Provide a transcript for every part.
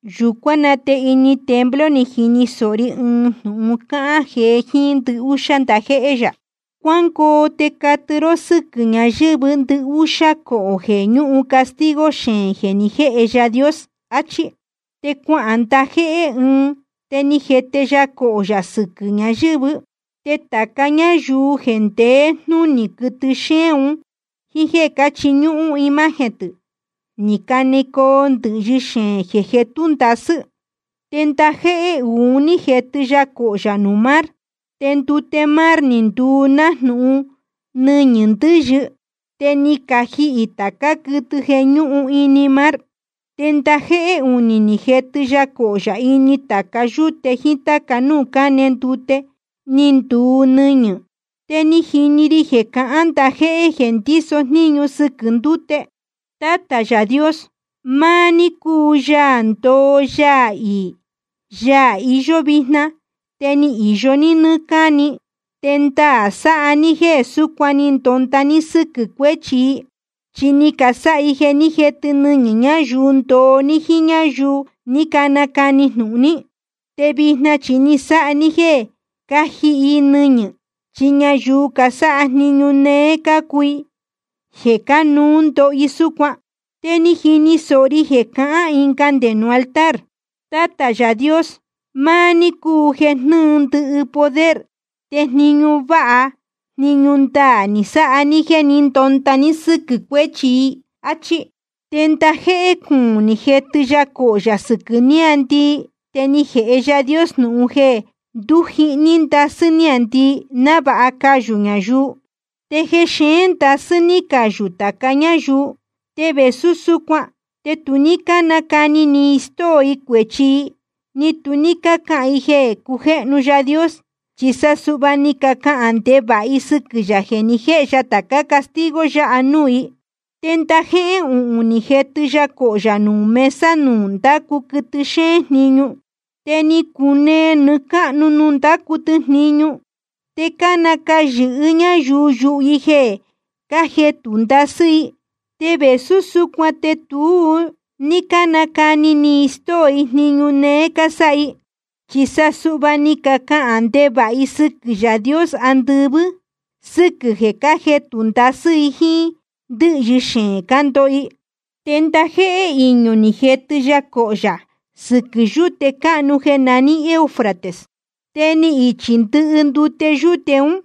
Yūcuán na te ini templo ni jini sōho ri ɨɨn jnūhun cáhán jee jíín ndɨhúxá ndajéhé yā: Cuangoo te catɨ ró sɨ́quɨ̄ ñayɨ̄vɨ́ ndɨhúxá cohō jeē ñúhun castigo xeēn jeē ni jéhe Yaā Dios, achí. Te cuahān ndajéhé ɨɨn, te ni jetɨ ya cohō yā sɨquɨ̄ ñayɨ̄vɨ́. Te tāca ñáyuu jeē ndeé jnunī quɨtɨ xéén un jíín jéē cáchiñúhún imagen tɨ̄, ni canecoo ndɨ̄hyɨ xeēn jeē jetú ndasɨ́. Te ndajéhé uū ni jetɨ ya cohō yā nuū mar, te ndute mar ni nduu nájnūhun nɨñɨ̄ ndɨ́yɨ. Te ni cajihī tācá quɨtɨ jeē ñúhun ini mar. Te ndajéhé unī ni jetɨ ya cohō yā ini tāca yúte jíín táca núū cáne ndute, te ni nduu nɨñɨ̄. Te ni jini ri jeē cahán ndajéhé jeē ndíso jníñu sɨquɨ̄ ndúte: Tátā Yaā Dios, maá ní cúu Yaā ndoo Yaā iī, Yaā iyó vijna, te ni īyo ní nɨ́ɨ́ cáni. Te ndaā sáha ní jeē súcuan ni ndonda ní sɨ́quɨ̄ cuéchi i. Chi ni casáha i jeē ní jetɨ nɨñɨ̄ ñayuu ndoo ní jíín ñáyuu ní canacani jnūhun ní. Te vijna chi ni sáha ní jéē cájihi i nɨñɨ̄, chi ñayuu casáha jniñu néé cácuu i, jeē cánuú ndoho i súcuan. Te ni jini sōho ri jeē cahán ɨnga nde nuū altar: Tátā Yaā Dios, máá ní cúu jeē jnɨ́ɨ ndɨhɨ poder. Te jniñu váha jniñu ndaā ni sáha ní jéē ní ndonda ní sɨ́quɨ̄ cuéchi i. Achí. Te ndajéhé cuūn ni jetɨ ya cohō yā sɨquɨ̄ níāndii, te ni jēhe Yaā Dios jnūhun jeē ndujíhní ndasɨ́ níāndii návāha cayū ñayuu. Te xeēn ndasɨ́ ní cayū tāca ñáyuu. Te vēsú súcuan te tu ní cánacani ni i stóo i cuēchi i, ni tu ní cácahān i jeē cujéhnu Yaā Dios. Chi sa suhva ni cacahān ndevāha i sɨquɨ̄ yā jeē ni jéhe ya tācá castigo yáha nuū i. Te ndajéhé uhūn ni jetɨ ya cohō yā nuū mesa nuū ndácu quɨtɨ xéén jniñu. Te ni cunee nɨɨ́ cáhnu nuū ndácu tɨ jniñu. Te cánacayɨ̄hɨ ñáyuu yuhu i jeē cájetū ndasɨ́ i. Te vēsú súcuan te tu ní cánacani ni i stóo i jniñu néé cásáha i. Chi sa ni cacahān ndevāha i sɨquɨ̄ Yaā Dios andɨvɨ́ sɨ́quɨ̄ jeē cájetū ndasɨ́ i jíín ndɨ́hyɨ xeēn cándoho i. Te ndajéhé iñū ni jetɨ ya cohō yā sɨquɨ̄ yúte cáhnu jeē naní Eufrates. Te ni ichi ndɨhɨ ndute yūte ún,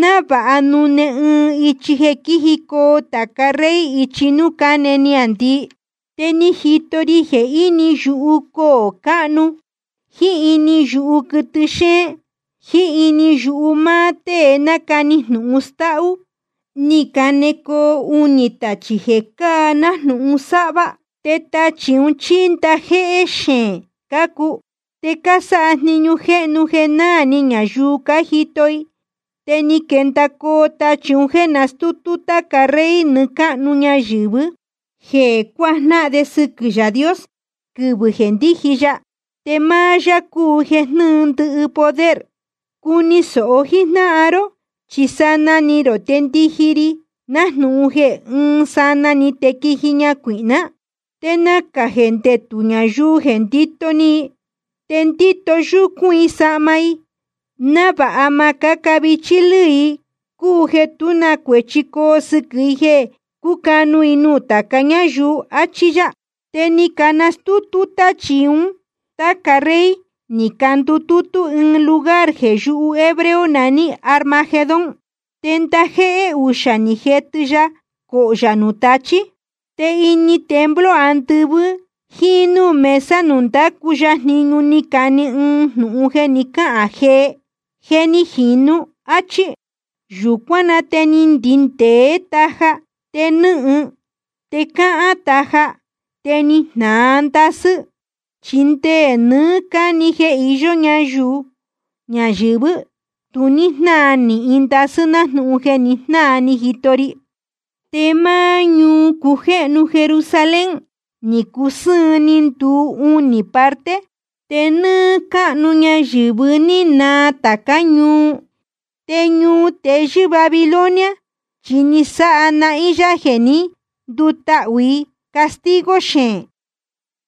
návāha nune ɨɨn ichi jeē quíjicoo tāca rey ichi núū cáne niāndii. Te ni jito ri jeē ini yuhu coō cáhnu jíín ini yuhu quɨtɨ xéén jiín ini yuhu máá tée nácani jnūhun stáhú ní canecoo unī tachī jeē cáa nájnūhun sáhvá. Te tachī ún chi ndajéhé jexeén cácuu, te cásáha jniñu jéhnu jeē náā ni ñayuu cájito i. Te ni quendacoo tachī un jéē nastútú táca rey nɨɨ́ cáhnu ñayɨ̄vɨ, jéē cuajnáhan de sɨquɨ̄ Yaā Dios quɨvɨ̄ jeē ndíji ya. Te máá yá cúu jeē jnɨ́ɨ ndɨhɨ poder. Cuni sōho jíjnáhan ró, chi sanaa ni rō te ndiji ri, nájnūhun jeē ɨɨn sanaa‑ni te quíji ñacuīhná. Te nacā jeē ndetū ñayuu jeē ndito ni i, te ndíto yúcún i sahma i, návāha ma cáca vichí lɨ́ɨ i, cúu jeē tú na cuēchi coo sɨquɨ̄ i jeē cucanu i nuū tāca ñáyuu, achí yá. Te ni canastútú táchī un táca rey, ni candutútú ɨɨn lugar jeē yuhu hebreo naní Armagedón. Te ndajéhé uxā ni jetɨ ya cohō yā nuū tachí. Te ini templo andɨvɨ́ jíín núū mesa nuū ndácu ya jniñu, ni cane ɨɨn jnūhun jeē ni cáhān jee: Je ni jīnu, áchí. Yūcuán na te ni ndindēé taja, te nɨ́hɨn, te cáhán taja, te ni jnāa ndasɨ́. Chi nde nɨɨ́ cáni jeē iyó ñáyuu ñayɨ̄vɨ́, tu ní jnáa nīhin ndasɨ́ nájnūhun jeē ni jnáa ni jito ri. Te máá ñuu cujéhnu Jerusalén, ni cusɨ́ɨn ni nduu unī parte, te nɨ́ɨ́ cáhnu ñayɨ̄vɨ́ ni naa tācá ñuu. Te ñuu teyɨ́ Babilonia, chi ni sáha nahín yá jeē ní ndutahū i castigo xeēn,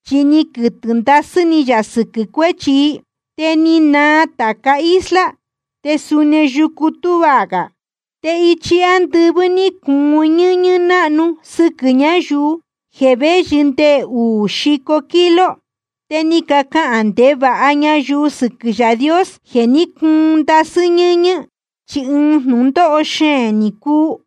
chi ni quɨtɨ̄ ndasɨ́ ni yā sɨquɨ̄ cuéchi i. Te ni naa tāca isla, te suni yucu tuá gā. Te ichi ándɨvɨ́ ní cuun ñɨ́ñɨ́ náhnu sɨquɨ̄ ñayuu, jeē véyɨ nde uū xico kilo. Te ni cacahān ndevāha ñayuu sɨquɨ̄ Yaā Dios jeē ní cuun ndasɨ́ ñɨ́ñɨ́, chi ɨɨn jnūndóho xeēn ni cuu.